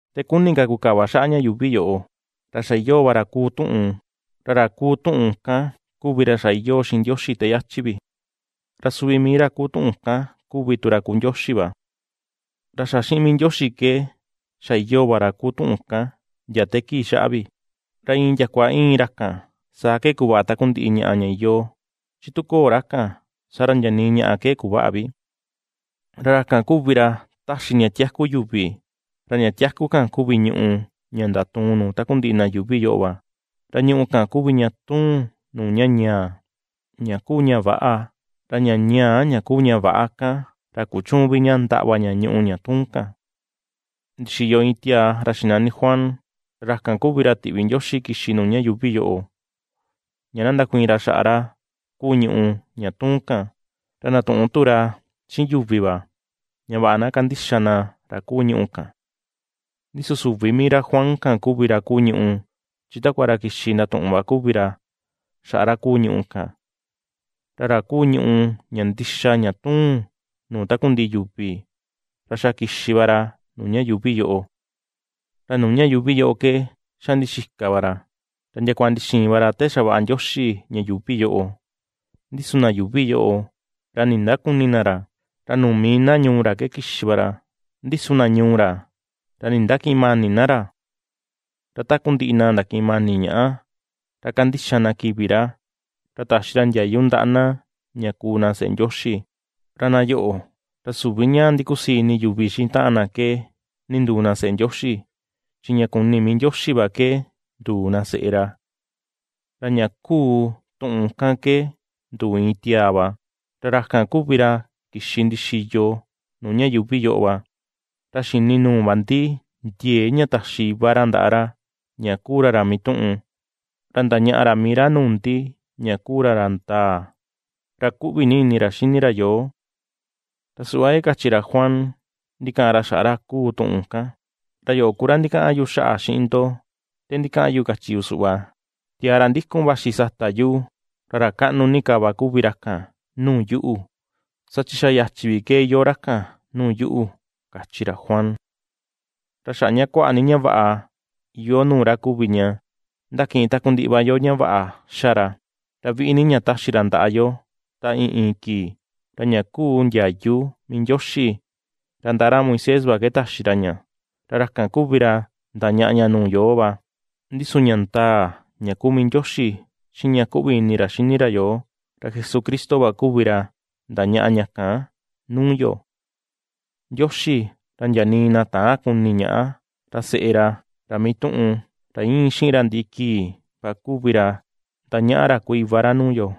Te kuni ka kukava xaꞌa ña yuuvi yoꞌo, ra xa iyoo va ra kuu tuꞌun. Ra ra kuu tuꞌun kan kuvi ra xa iyoo xiꞌin Ndioxi te yachi vi. Ra suvi mii ra kuu tuꞌun kan kuvi tu ra kuu Ndioxi va. Ra xa xiꞌin mii Ndioxi ke, xa iyoo va ra kuu tuꞌun kan ndia te kii xaꞌa vi. Ra iin ndiakua íin ra kan saa ke kuvaꞌa takundiꞌi ñaꞌa ña iyoo, chi tu köo ra kan, saa ra ndia nii ñaꞌa ke kuväꞌa vi. Ra ra kan kuvi ra ^taxi ña tiaku yuvi, ra ña tiaku kan kuvi ñùꞌù ña ^ndatuun nuu takundiꞌi na yuuvi yoꞌo va. Ra ñùꞌù kan kuvi ña tuun nuu ña ñaa, ña kuu ña väꞌa; ra ña ñaa ña kuu ña väꞌa kan, ra kuchüun vi ña ndaꞌva ña ñuꞌu ña tuun kan. Ndixiyo iin tiaa ra xinani Juan, ra ra kan kuvi ra tiꞌvi Ndioxi kixi nuu ña yuuvi yoꞌo, ña na ndakuiin ra xaꞌa ra kuu ñuꞌu ña tuun kan, ra ndatuꞌun tu ra xiꞌin yuvi va, ña vaꞌa na kandixa na ra kuu ñuꞌu kan. Ndi su süvi mii ra Juan kan kuvi ra kuu ñùꞌù, chi takua ra kixi ndatuꞌun va kuvi ra xaꞌa ra kuu ñùꞌù kan. Ra ra kuu ñùꞌù ña ndixa ña tuun nuu takundiꞌi yuvi, ra xa kixi va ra nuu ña yuuvi yoꞌo. Ra nuu ña yuuvi yoꞌo ke xa ndixika va ra, ra ndiakua ndixiin va ra te xavaꞌa Ndioxi ña yuuvi yoꞌo, ndi su na yuuvi yoꞌo, ra nindükuni na ra. Ra nuu mii na ñuu ra ke kixi va ra, ndi su na ñuu ra ra nindakïꞌin mani na ra. Ra takundiꞌi na ndakiꞌin mani ñaꞌa, ra ^kandixa na kivi ra, ra taxi ra ndiayu ndaꞌa na ña ^kuu na seꞌe Ndioxi. Ra na yoꞌo, ra süvi ña ndikusii ini yuvi xiꞌin taꞌan na ke ninduu na seꞌe Ndioxi, chi ña kuni mii Ndioxi va ke nduu na seꞌe ra. Ra ña kuu tuꞌun kan ke nduu iin tiaa va, ra ra kan kuvi ra kixi ndixiyo nuu ña yuuvi yoꞌo va. Ra xini nuu va ndi ndiee ña taxi iva ra ndaꞌa ra, ña kuu ra ra mituꞌun, ra ndañaꞌa ra mii ra nuu ndi ña kuu ra ra ndaa, ra kuꞌvi ni ini ra xini ra yoo. Ra suꞌva ke kachi ra Juan ndikaꞌan ra xaꞌa ra kuu tuꞌun kan: ―Ra yoꞌo ku ra ndikaꞌan yu xaꞌa xiꞌin ndo, te ndikaꞌan yu kachi yu suꞌva: “Tiaa ra ndikun vaxi chi sata yuꞌu, ra ra kaꞌnu ni ka va kuvi ra kan nuu yuꞌu, saa chi xa yachi vi ke iyoo ra kan nuu yuꞌu” ―kachi ra Juan. Ra xaꞌa ña kuaꞌa ni ña vaꞌa iyoo nuu ra kuvi ña ^ndakiꞌin takundiꞌi va yo ña vaꞌa ^xa ra, ra viꞌi ni ña ^taxi ra ndaꞌa yo ta iin iin kii. Ra ña kuu ndiayu mii Ndioxi, ra ndaꞌa ra Moisés va ke taxi ra ña, ra ra kan kuvi ra ndañaꞌa ña nuu yoo va, ndi su ña ndaa, ña ku mii Ndioxi xiꞌin ña kuꞌvi ni ini ra xini ra yoo, ra Jesucristo va kuvi ra ndañaꞌa ña kan nuu yo. Ndioxi ra ndia nii na täan kuni ñaꞌa ra seꞌe ra, ra mituꞌun, ra íin xiꞌin ra ndiꞌi kii va kuvi ra ^ndañaꞌa ra kuu iva ra nuu yo.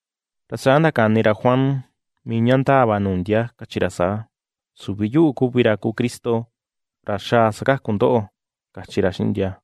Ra saa ndakani ra Juan mii ña ndaa va nuu ndia kachi ra saa: ―Süvi yuꞌu kuvi ra kuu Cristo, ra xaa sakaku ndoꞌo ―kachi ra xiꞌin ndia.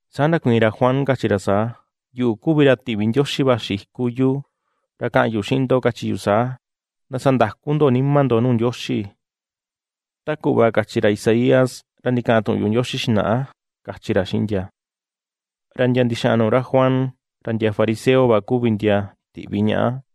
Saa ndakuiin ra Juan kachi ra saa: ―Yuꞌu kuvi ra tiꞌvi Ndioxi vaxi iku iyu, ra ^kaꞌan yu xiꞌin ndo kachi yu saa: “Ndasandaku ndo nima ndo nuu Ndioxi”, ta kuꞌva kachi ra Isaías ra ndikaꞌan tuꞌun yuꞌu Ndioxi xinaꞌa ―kachi ra xiꞌin ndia. Ra ndia ndixaꞌan nuu ra Juan, ra ndia fariseo va kuvi ndia tiꞌvi ñaꞌa.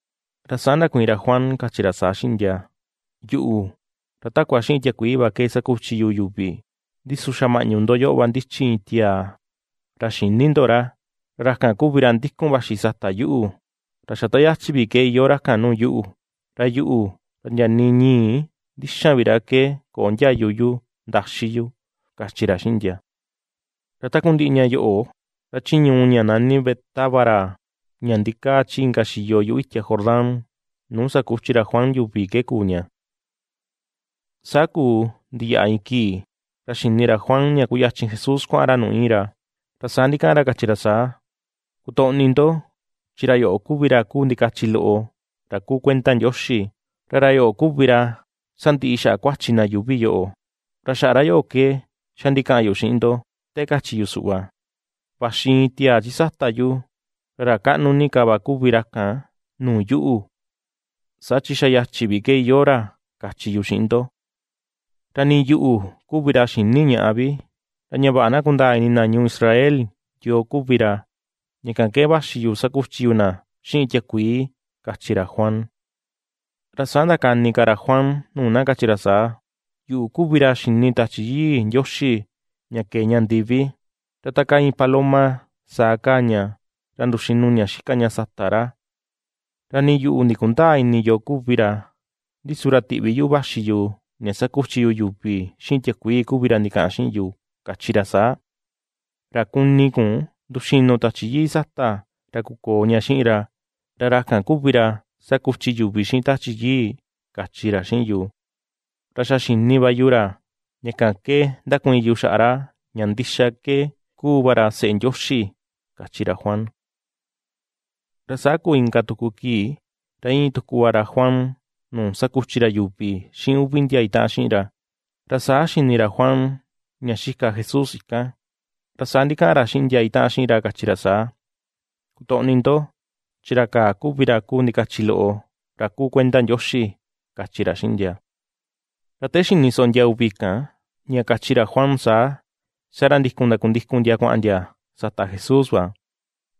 Ra saa ndakuiin ra Juan, kachi ra saa xiꞌin ndia: ―Yuꞌu, ra takua xiꞌin tiakuii va ke ^sakuchi yu yuvi, ndi su xa maꞌñu ndo yoꞌo va ndichi iin tiaa, ra xïni ndo ra. Ra ra kan kuvi ra ndikun vaxi sata yuꞌu, ra xa ta yachi vi ke iyoo ra kan nuu yuꞌu. Ra yuꞌu, ra ndia nii ñii ndixan vi ra ke köo ndiayu yu ndaxi yu ―kachi ra xiꞌin ndia. Ra takundiꞌi ña yoꞌo, ra chi ñuu ña nani Betábara ña ndikaa chi inka xiyo yuꞌu itia Jordán nuu ^sakuchi ra Juan yu̱vi ke kuu ña. Saa kuu ndiyaꞌa iin kii, ra xini ra Juan ña kuyachin Jesús kuaꞌan ra nuu íin ra. Ra saa ndikaꞌan ra kachi ra saa: ―Kutoꞌni ndo, chi ra yoꞌo kuvi ra kuu ndikachi loꞌo ra kuu kuenda Ndioxi, ra ra yoꞌo kuvi ra sandiꞌi xaꞌa kuachi na yuuvi yoꞌo. Ra xaꞌa ra yoꞌo ke xa ndikaꞌan yu xiꞌin ndo, te kachi yu suꞌva: “Vaxi iin tiaa chi sata yu, ra ra kaꞌnu ni ka va kuvi ra kan nuu yuꞌu, saa chi xa yachi vi ke iyoo ra”, kachi yu xiꞌin ndo. Ra nii yuꞌu kuvi ra xïni ñaꞌa vi; ra ña vaꞌa na kundaa ini na ñuu Israel yoo kuvi ra, ña kan ke ^vaxi yu sakuchi yu na xiꞌin tiakuii, ―kachi ra Juan. Ra saa ndakani ka ra Juan nuu na kachi ra saa: ―Yuꞌu kuvi ra xini Tachi Yii Ndioxi ña kee ña ndiví, ra ta kaa iin paloma, saa kaa ña, ra nduxinu ña xika ña sata ra. Ra nii yuꞌu ndikundäa ini yoo kuvi ra, ndi su ra tiꞌvi yuꞌu vaxi yu, ña ^sakuchi yu yu̱vi xiꞌin tiakuii kuvi ra ndikaꞌan xiꞌin yu, kachi ra saa: “Ra kuni kun nduxínu̱ Tachi Yii sata ra kukoo ña xiꞌin ra, ra ra kan kuvi ra ^sakuchi yuvi xiꞌin Tachi Yii”, kachi ra xiꞌin yu. Ra xa xini va yu ra, ña kan ke ^ndakuiin yu xaꞌa ra ña ndixa ke kúú va ra Seꞌe Ndioxi ―kachi ra Juan. Ra saa kuu inka tuku kii, ra íin tuku va ra Juan nuu sakuchi ra yuvi xiꞌin uvi ndia itaꞌan xiꞌin ra. Ra saa xini ra Juan ña xika Jesús ika̱n, ra saa ndikaꞌan ra xiꞌin ndia itaꞌan xiꞌin ra, kachi ra saa: ―Kutoꞌni ndo, chi ra kaa kuvi ra kuu ndikachi loꞌo ra kuu kuenda Ndioxi ―kachi ra xiꞌin ndia. Ra te xini soꞌo ndia uvi kan ña kachi ra Juan saa, saa ra ndikun ndakundikun ndia kuaꞌan ndia sata Jesús va.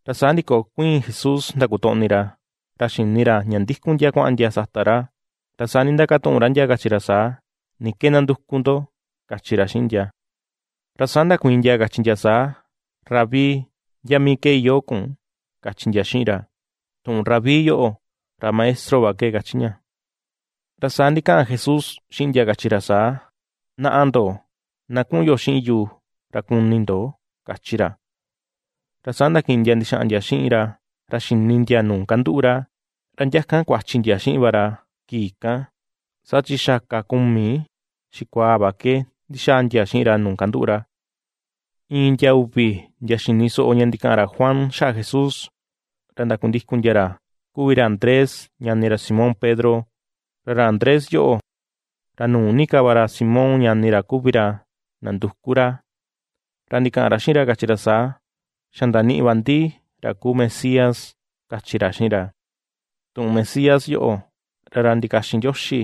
Ra saa ndikokuiin Jesús ndakutoꞌni ra, ra xini ra ña ndikun ndia kuaꞌan ndia sata ra, ra saa ndindakatuꞌun ra ndia kachi ra saa: ―¿Ni ke ^ndanduku ndo? ―kachi ra xiꞌin ndia. Ra saa ndakuiin ndia kachi ndia saa: ―Rabí, ¿ndia mii ke iyoo kun? ―kachi ndia xiꞌin ra. Tuꞌun “Rabí” yoꞌo, ra “maestro” va ke kachi ña. Ra saa ndikaꞌan Jesús xiꞌin ndia, kachi ra saa: ―Naꞌa ndo, na kuꞌun yo xiꞌin yu ra kuni ndo ―kachi ra. Ra saa ndakiꞌin ndia ndixaꞌan ndia xiꞌin ra, ra xini ndia nuu kanduꞌu ra; ra ndia kan kuachi ndia xiꞌin va ra kii kan, saa chi xa kaa kumi xikuaa va ke ndixaa ndia xiꞌin ra nuu kanduꞌu ra. Iin ndia uvi, ndia xini soꞌo ña ndikaꞌan ra Juan xaꞌa Jesús, ra ndakundikun ndia ra kuvi ra Andrés ñani ra Simón Pedro. Ra ra Andrés yoꞌo, ra nu̱ú ni ka va ra Simón ñani ra kuvi ra nanduku ra, ra ndikaꞌan ra xiꞌin ra kachi ra saa: ―Xa ndaniꞌi va ndi ra kuu Mesías ―kachi ra xiꞌin ra. Tuꞌun Mesías yoꞌo, ra “Ra ndikaxin Ndioxi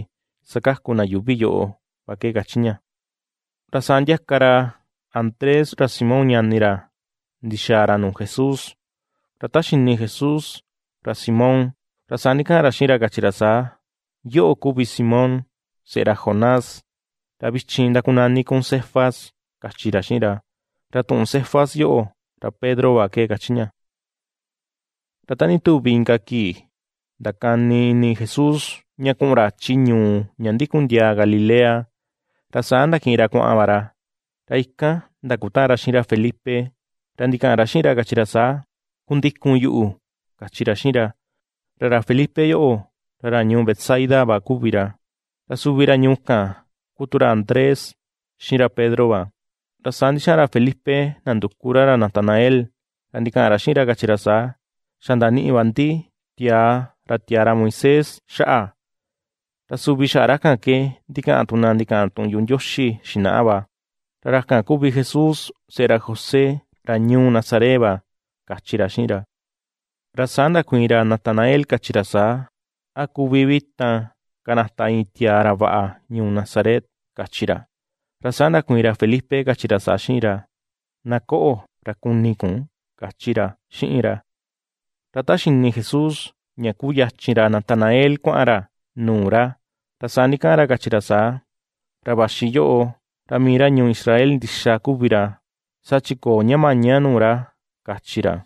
sakaku na yuuvi yoꞌo” va ke kachi ña. Ra saa ndiaka ra Andrés ra Simón ñani ra ndixaa ra nuu Jesús. Ra ta xini Jesús ra Simón, ra saa ndikaꞌan ra xiꞌin ra kachi ra saa: ―Yoꞌo kuvi Simón, seꞌe ra Jonás, ra vichin ndakunani kun Cefas ―kachi ra xiꞌin ra. Ra tuꞌun Cefas yoꞌo, ra Pedro va ke kachi ña. Ra ta ndituvi inka kii ndakani ini Jesús ña kuꞌun ra chi ñuu ña ndikun ndiaa Galilea. Ra saa ndakiꞌin ra kuaꞌan va ra, ra ikan ndakutaꞌan ra xiꞌin ra Felipe ra ndikaꞌan ra xiꞌin ra, kachi ra saa: ―Kundikun yuꞌu ―kachi ra xiꞌin ra. Ra ra Felipe yoꞌo, ra ra ñuu Betsaida va kuvi ra, ra suvi ra ñuu kan ku tu ra Andrés xiꞌin ra Pedro va. Ra saa ndixaꞌan ra Felipe nanduku ra ra Natanael ra ndikaꞌan ra xiꞌin ra kachi ra saa: ―Xa ndaniꞌi va ndi tia̱à ra tiaa ra Moisés xaꞌa, ra suvi xaꞌa ra kan ke ndikaꞌan tu na ndikaꞌan tuꞌun yuꞌu Ndioxi xinaꞌa va. Ra ra kan kuvi Jesús, seꞌe ra José ra ñuu Nazaret va ―kachi ra xiꞌin ra. Ra saa ndakuiin ra Natanael kachi ra saa: ―¿A kuvi vi tan kanata iin tiaa ra vaꞌa ñuu Nazaret? ―kachi ra. Ra saa ndakuiin ra Felipe kachi ra saa xiꞌin ra: ―Na koꞌo, ra kuni kun ―kachi ra xiꞌin ra. Ra ta xini Jesús ña ^kuyachin ra Natanael kuaꞌan ra nuu ra, ra saa ndikaꞌan ra kachi ra saa: ―Ra ^vaxi yoꞌo ra mii ra ñuu Israel ndixa kuvi ra, saa chi köo ña maña nuu ra ―kachi ra.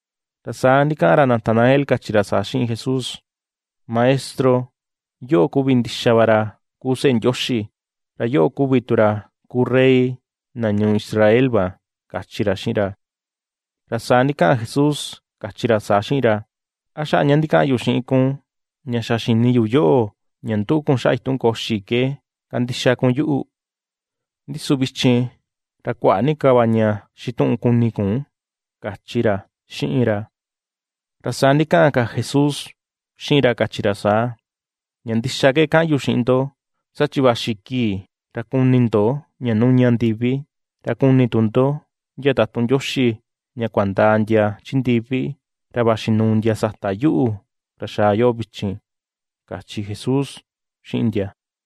Ra saa ndikaꞌan ra Natanael kachi ra saa xiꞌin Jesús: ―Maestro, yoꞌo kuvi ndixa va ra kuu Seꞌe Ndioxi, ra yoꞌo kuvi tu ra kuu Rey na ñuu Israel va ―kachi ra xiꞌin ra. Ra saa ndikaꞌan Jesús kachi ra saa xiꞌin ra: ―¿A xaꞌa ña ndikaꞌan yu xiꞌin kun ña xa xini yu yoꞌo, ña ^nduꞌu kun xaꞌa itun koxi ke kandixa kun yuꞌu? Ndi su vichin ra kuaꞌa ni ka va ña xituꞌun kuni kun ―kachi ra xiꞌin ra. Ra saa ndikaꞌan ka Jesús xiꞌin ra kachi ra saa: ―Ña ndixa ke ^kaꞌan yu xiꞌin ndo, saa chi vaxi kii, ra kuni ndo ña nuña ndivi, ra kuni tu ndo ndia tatun Ndioxi ña kuanda̱a ndia chi ndivi, ra vaxi nuu ndia sata yuꞌu ra xaa yoꞌo vichin ―kachi Jesús xiꞌin ndia.